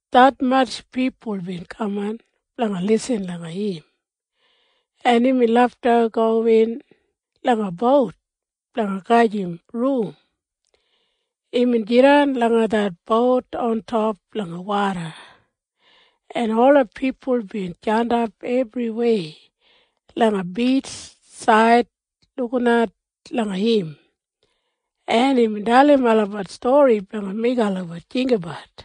Detmatj pipul bin kaman blanga lisin langa im, en imbin lafta gowin langa bout blanga gajim rum. Imbin jidan langa det bout ontop langa woda, en ola pipul bin jandap ebriwei langa bitjsaid lukinat langa im, en imbin dalim olabat stori blanga meigim olabat jinggabat.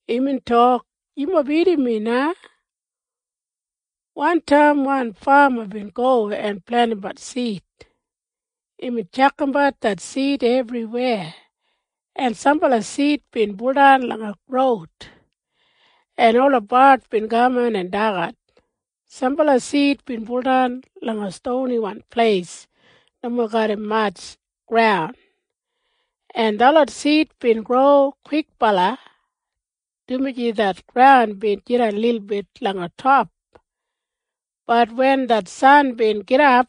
Imbin tok, “Yumob irrim mi na. Wantaim wan fama bin go en plentimbat sid. Imbin tjakambat det sid ebriweya, en sambala sid bin buldan langa roud, en ola bard bin kaman en dagat. Sambala sid bin buldan langa stoniwan pleis nomo garram matj graun, en detlot sid bin gro kwikbala, dumaji det graun bin jidan lilbit langa top. Bat wen det san bin gidap,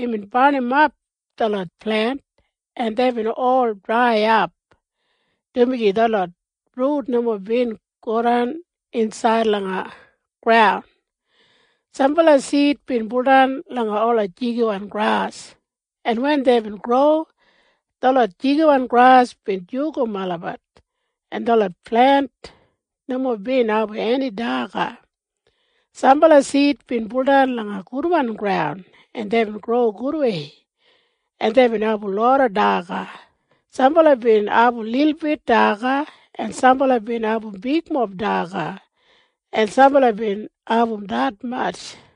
imbin barnimap detlot plent en deibin ol draiyap, dumaji detlot rut nomo bin godan insaid langa graun. Sambala sid bin buldan langa ola jigiwan gras, en wen deibin gro, detlot jigiwan gras bin jugum olabat, en detlot plent, nomo bin abum eni daga. Sambala sid bin buldan langa gudwan graun, en deibin gro gudwei, en deibin abum loda daga. Sambala bin abum lilbit daga, en sambala bin abum bigmob daga, en sambala bin abum detmatj.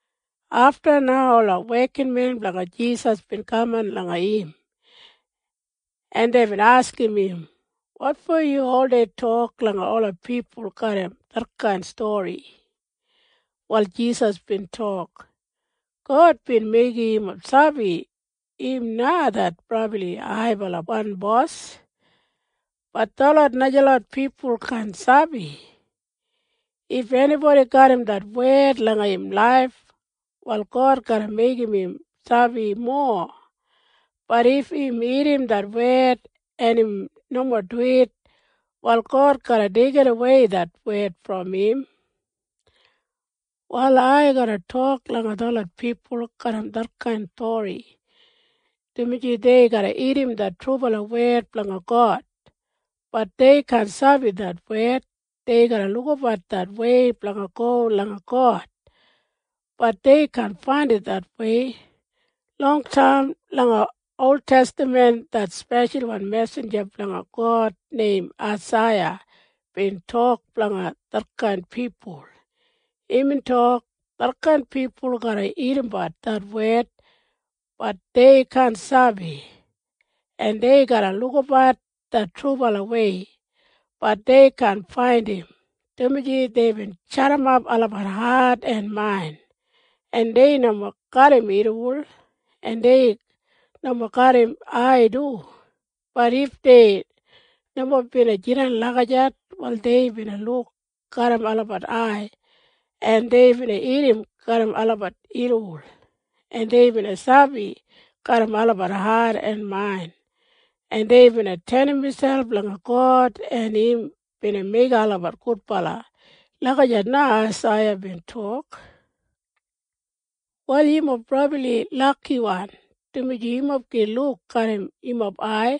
Afta na ola wekinmen blanga Jisas bin kaman langa im, en deibin askim im, “Wotfo yu oldei tok langa ola pipul garram detkain stori?” Wal Jisas bin tok, “God bin meigim yumob sabi im na det brabli haibalawan Bos, bat detlot najalot pipul kaan sabi. If enibodi garram det wed langa im laif, wal God garra meigim im sabi mowa. Bat if im irrim det wed, en im nomo duwit, wal God garra deigidawei det wed brom im. “Wal ai garra tok langa detlot pipul garram detkain stori, dumaji dei garra irrim det trubala wed blanga God. Bat dei kaan sabi det wed. Dei garra lukabat det wei blanga go langa God. Bat dei kaan faindim det wei. Longtaim langa oltestaman det speshalwan mesinja blanga God neim Aisaiya bin tok blanga detkain pipul. Imbin tok, ‘Detkain pipul garra irrimbat det wed. Bat dei kaan sabi. En dei garra lukabat det trubalawei. Bat dei kaan faindim, dumaji deibin jadimap olabat hat en main, en dei nomo garram irriwol, en dei nomo garram ai du. Bat if dei nomo bina jidan lagijat, wal dei bina luk garram olabat ai, en dei bina irrim garram olabat irriwol, en dei bina sabi garram olabat hat en main, en dei bina tenim miselp langa God, en im bina meigim olabat gudbala.’ Lagijat na Aisaiya bin tok. “Wal yumob brabli lakiwan, dumaji yumob gin luk garram yumob ai,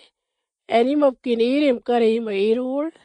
en yumob gin irrim garram yumob irriwol.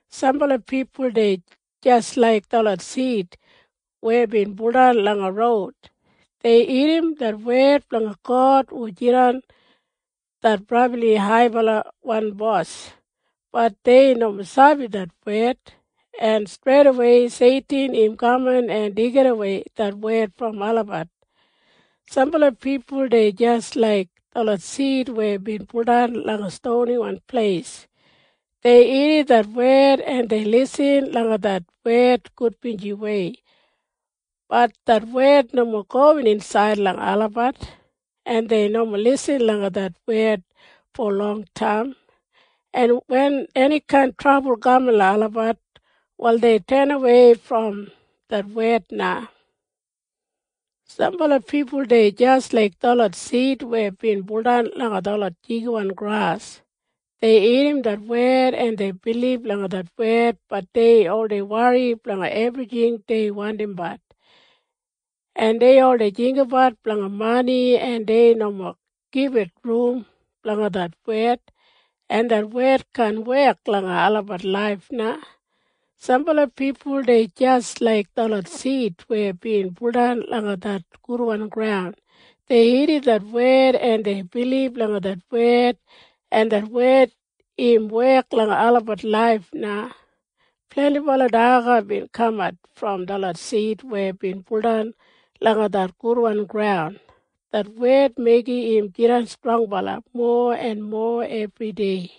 Sambala pipul dei jis laik detlot sid weya bin buldan langa roud. Dei irrim det wed blanga God hu jidan det brabli haibalawan Bos. Bat dei nomo sabi det wed, en streidawei Seitin im kaman en deigidawei det wed brom olabat. Sambala pipul dei jis laik detlot sid weya bin buldan langa stoniwan pleis. Dei irrim det wed, en dei lisin langa det wed gudbinjiwei. Bat det wed nomo gowin insaid langa olabat, en dei nomo lisin langa det wed fo longtaim, en wen enikain trabul kaman langa olabat, wal dei tenawei brom det wed na. Sambala pipul dei jis laik detlot sid weya bin buldan langa detlot jigiwan gras. Dei irrim det wed, en dei bilib langa det wed. Bat dei oldei wori blanga ebrijing dei wandimbat, en dei oldei jinggabat blanga mani, en dei nomo gibit rum blanga det wed, en det wed kaan wek langa olabat laif na. Sambala pipul dei jis laik detlot sid weya bin buldan langa det gudwan graun. Dei irrim det wed, en dei bilib langa det wed, en det wed im wek langa olabat laif na. Blendibala daga bin kamat brom detlot sid weya bin buldan langa det gudwan graun. Det wed meigim olabat jidan strongbala mowa en mowa ebridei.”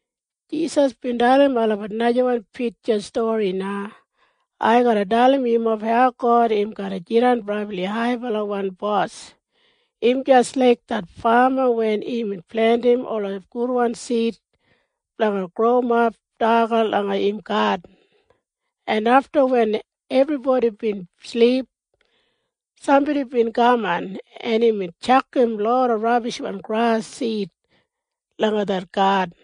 Jisas bin dalim olabat najawan pitja stori na. Imbin tok, “Ai garra dalim yumob hau God im garra jidan brabli haibalawan Bos. Im jis laik det fama wen imbin plentim ola gudwan sid blanga growimap daga langa im gadin, en afta wen ebribodi bin silip, sambodi bin kaman en imbin tjakam loda rabishwan gras sid langa det gadin.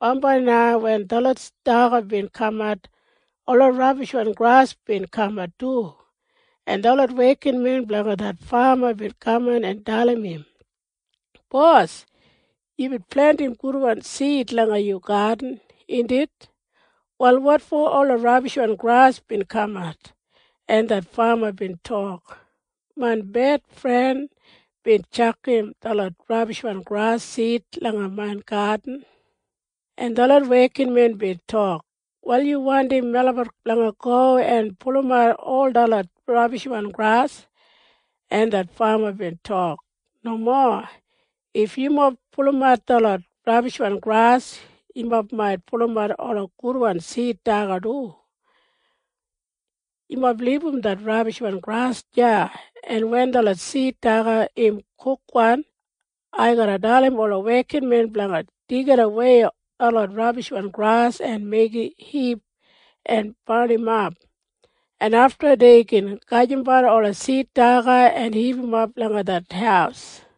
Bambai na wen detlot daga bin kamat, ola rabishwan gras bin kamat du, en detlot wekinmen blanga det fama bin kaman en dalim im, ‘Bos, yubin plentim gudwan sid langa yu gadin, indit? Wal wotfo ola rabishwan gras bin kamat?’ En det fama bin tok, ‘Main bedfren bin tjakam detlot rabishwan gras sid langa main gadin.’ En detlot wekinmen bin tok, ‘Wal yu wandim melabat blanga go en pulumat ol detlot rabishwan gras?’ En det fama bin tok, ‘Nomo. If yumob pulumat detlot rabishwan gras, yumob mait pulumat ola gudwan sid daga du. Yumob libum det rabishwan gras deya, en wen detlot sid daga im kukwan, ai garra dalim ola wekinmen blanga deigidawei detlot rabishwan gras en meigim hip en barnimap, en afta dei gin gajimbat ola sid daga en hipimap langa det haus.’”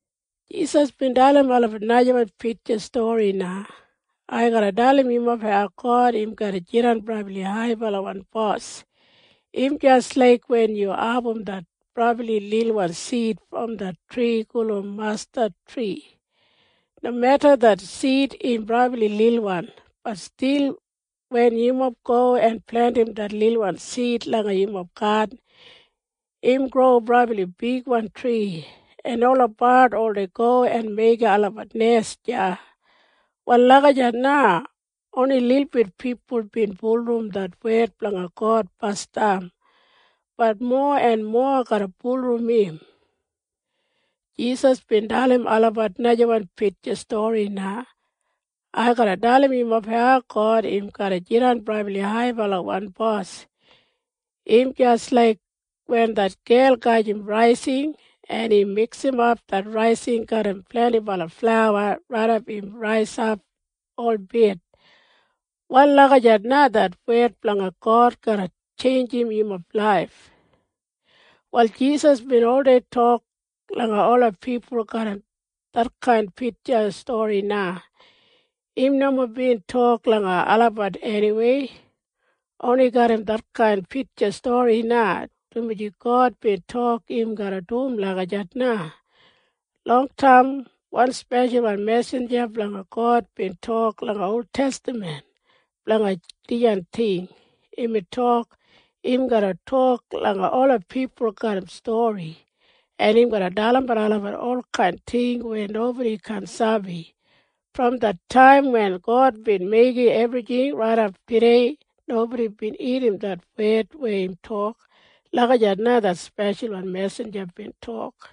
Jisas bin dalim olabat najawan pitja stori na. Imbin tok, “Ai garra dalim yumob hau God im garra jidan brabli haibalawan Bos. Im jis laik wen yu abum det brabli lilwan sid brom det tri gulum mastadtri. Nomeda det sid im brabli lilwan, bat stil wen yumob go en plentim det lilwan sid langa yumob gadin, im gro brabli bigwan tri, en ola bard oldei go en meigim olabat nes deya. Wal lagijat na oni lilbit pipul bin bulurrum det wed blanga God basdam. Bat mowa en mowa garra bulurrum im.” Jisas bin dalim olabat najawan pitja stori na. Imbin tok, “Ai garra dalim yumob hau God im garra jidan brabli haibalawan Bos. Im jis laik wen det gel gajim raising, en im miksimap det raising garram blendibala flauwa raidap im raisap holbit. Wal lagijat na det wed blanga God garra tjeinjim yumob laif.” Wal Jisas bin oldei tok langa ola pipul garram detkain pitja stori na. Im nomo bin tok langa olabat eniwei. Oni garram detkain pitja stori na, dumaji God bin tok im garra dum lagijat na. Longtaim wan speshalwan mesinja blanga God bin tok langa oltestaman blanga dijan ting. Imbin tok, “Im garra tok langa ola pipul garram stori, en im garra dalimbat olabat olkain ting weya nobodi kaan sabi. Brom det taim wen God bin meigim ebrijing raidap tudei nobodi bin irrim det wed weya im tok.” Lagijat na det speshalwan mesinja bin tok.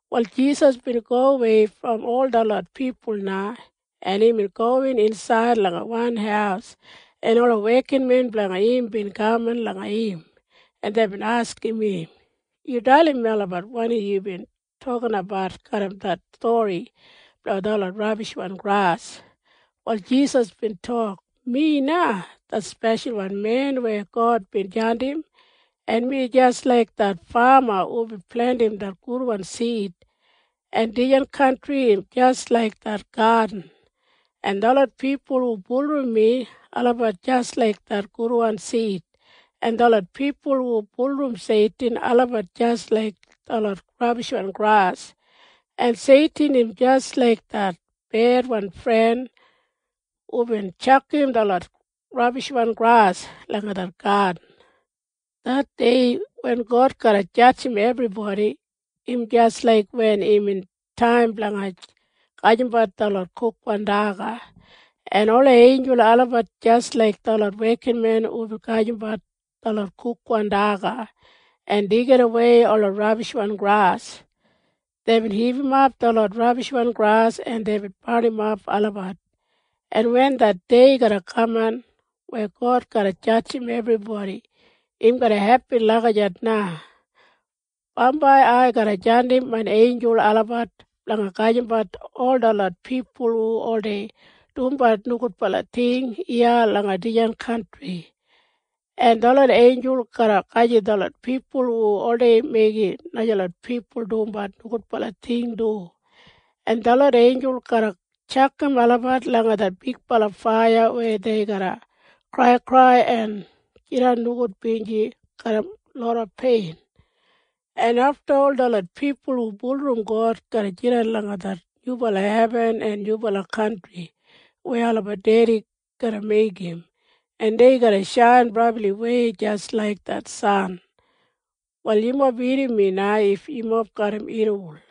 Wal Jisas bin gowei brom ol detlot pipul na, en imbin gowin insaid langa wan haus, en ola wekinmen blanga im bin kaman langa im, en deibin askim im, “Yu dalim melabat wanim yubin tokinabat garram det stori blanga detlot rabishwan gras.” Wal Jisas bin tok, “Mi na det Speshalwan Men weya God bin jandim, en mi jis laik det fama hubin plentim det gudwan sid, en dijan kantri im jis laik det gadin, en detlot pipul hu bulurrum mi, olabat jis laik detlot gudwan sid, en detlot pipul hu bulurrum Seitin, olabat jis laik detlot rabishwan gras, en Seitin im jis laik det bedfren hubin tjakam detlot rabishwan gras langa det gadin. Det dei wen God garra jadjim ebribodi, im jis laik wen imbin taim blanga gajimbat detlot kukwan daga, en ola einjul olabat jis laik detlot wekinmen hubin gajimbat detlot kukwan daga en deigidawei ola rabishwan gras. “Deibin hipimap detlot rabishwan gras en deibin barnimap olabat. En wen det dei garra kaman weya God garra jadjim ebribodi, im garra hepin lagijat na. Bambai ai garra jandim main einjul olabat blanga gajimbat ol detlot pipul hu oldei dumbat nogudbala ting iya langa dijan kantri, en detlot einjul garra gajim detlot pipul hu oldei meigim najalot pipul dumbat nogudbala ting du, en detlot einjul garra tjakam olabat langa det bigbala faiya weya dei garra kraikrai en jidan nogudbinji garram loda pein, en afta ol detlot pipul hu bulurrum God garra jidan langa det nyubala hebin en nyubala kantri weya olabat Dedi garra meigim, en dei garra shain brabliwei jis laik det san. “Wal yumob irrim mi na if yumob garram irriwol.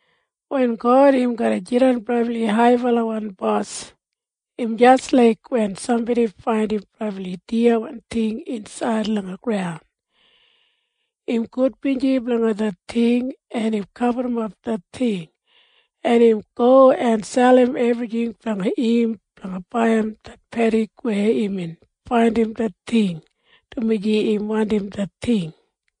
“Wen God im garra jidan brabli haibalawan Bos im jis laik wen sambodi faindim brabli diyawan ting insaid langa graun. Im gudbinji blanga det ting, en im gaburrumap det ting, en im go en selim ebrijing blanga im blanga baiyim det pedik weya imbin faindim det ting dumaji im wandim det ting.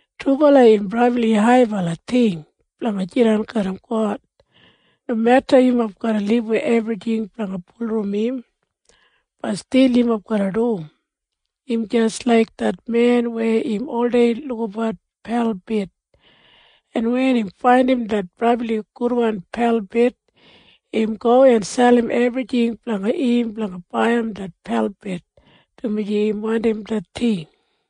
“Trubala im brabli haibala ting blanga jidan garram God. Nomeda yumob garra libum ebrijing blanga bulurrum im, bat stil yumob garra dum. Im jis laik det men weya im oldei lukabat pelbid, en wen im faindim det brabli gudwan pelbid, im go en selim ebrijing blanga im blanga baiyim det pelbid, dumaji im wandim det ting.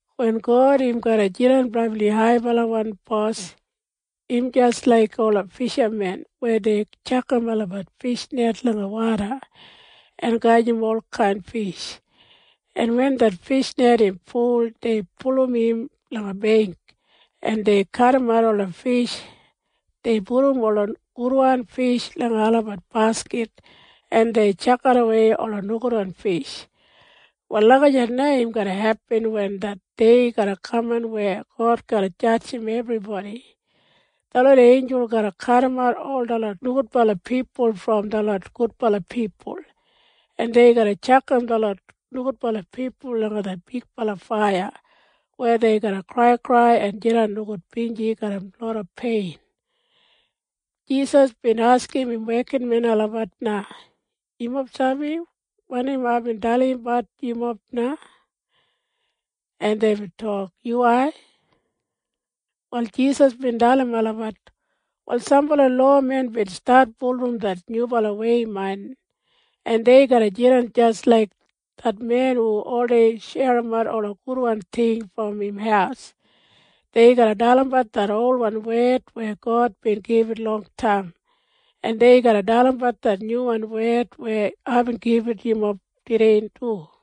“Wen God im garra jidan brabli haibalawan Bos im jis laik ola fishamen weya dei tjakam olabat fishnet langa woda en gajim olkain fish, en wen det fishnet im ful, dei pulum im langa beingk, en dei kadimat ola fish. Dei pudum ola gudwan fish langa olabat bakit, en dei tjakidawei ola nogudwan fish. Wal lagijat na im garra hepin wen det dei garra kaman weya God garra jadjim ebribodi. Detlot einjul garra kadimat ol detlot nogudbala pipul brom detlot gudbala pipul, en dei garra tjakam detlot nogudbala pipul langa det bigbala faiya weya dei garra kraikrai en jidan nogudbinji garram loda pein.” Jisas bin askim im wekinmen olabat na, “Yumob sabi wanim aibin dalimbat yumob na?” En deibin tok, “Yuwai.” Wal Jisas bin dalim olabat, “Wal sambala lowamen bin stat bulurrum det Nyubalawei main, en dei garra jidan jis laik det men hu oldei sherimat ola gudwan ting brom im haus. Dei garra dalimbat det olwan wed weya God bin gibit longtaim, en dei garra dalimbat det nyuwan wed weya aibin gibit yumob tudei du.”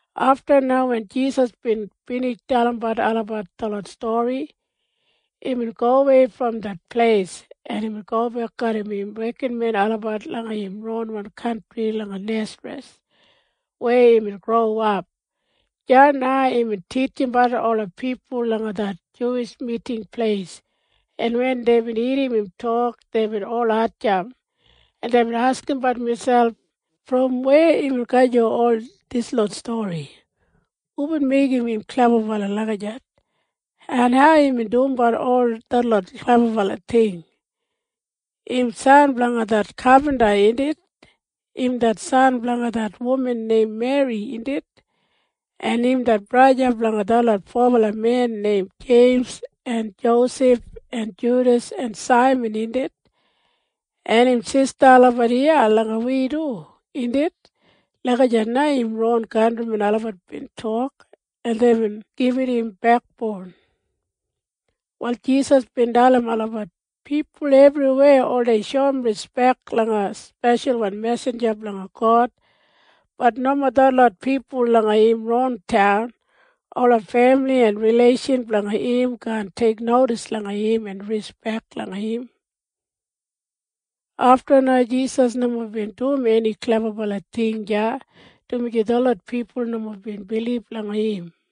Afta na wen Jisas bin binij dalimbat olabat detlot stori, imbin gowei brom det pleis, en imbin gobek garram im wekinmen olabat langa im ron kantri langa Nesareth weya imbin growap. Deya na imbin titjimbat ola pipul langa det Juwish Miting Pleis, en wen deibin irrim im tok, deibin ol hatjamp, en deibin askimbat miselp, “Brom weya imbin gajim ol dislot stori? Hubin meigim im klebabala lagijat? En hau im dumbat ol detlot klebabala ting? Im san blanga det kapinta, indit? Im det san blanga det wuman neim Meri, indit? En im det braja blanga detlot fobala men neim Jeims en Josef en Judas en Saiman, indit? En im sista olabat iya langa wi du, indit?” Lagijat na im ron kantrimen olabat bin tok, en deibin gibit im bekboun. Wal Jisas bin dalim olabat, “Pipul ebriweya oldei shoum rispek langa speshalwan mesinja blanga God. Bat nomo detlot pipul langa im ron taun. Ola femili en rileishan blanga im kaan teiknodis langa im en rispek langa im.” Afta na Jisas nomo bin dum eni klebabala ting deya, dumaji detlot pipul nomo bin bilib langa im.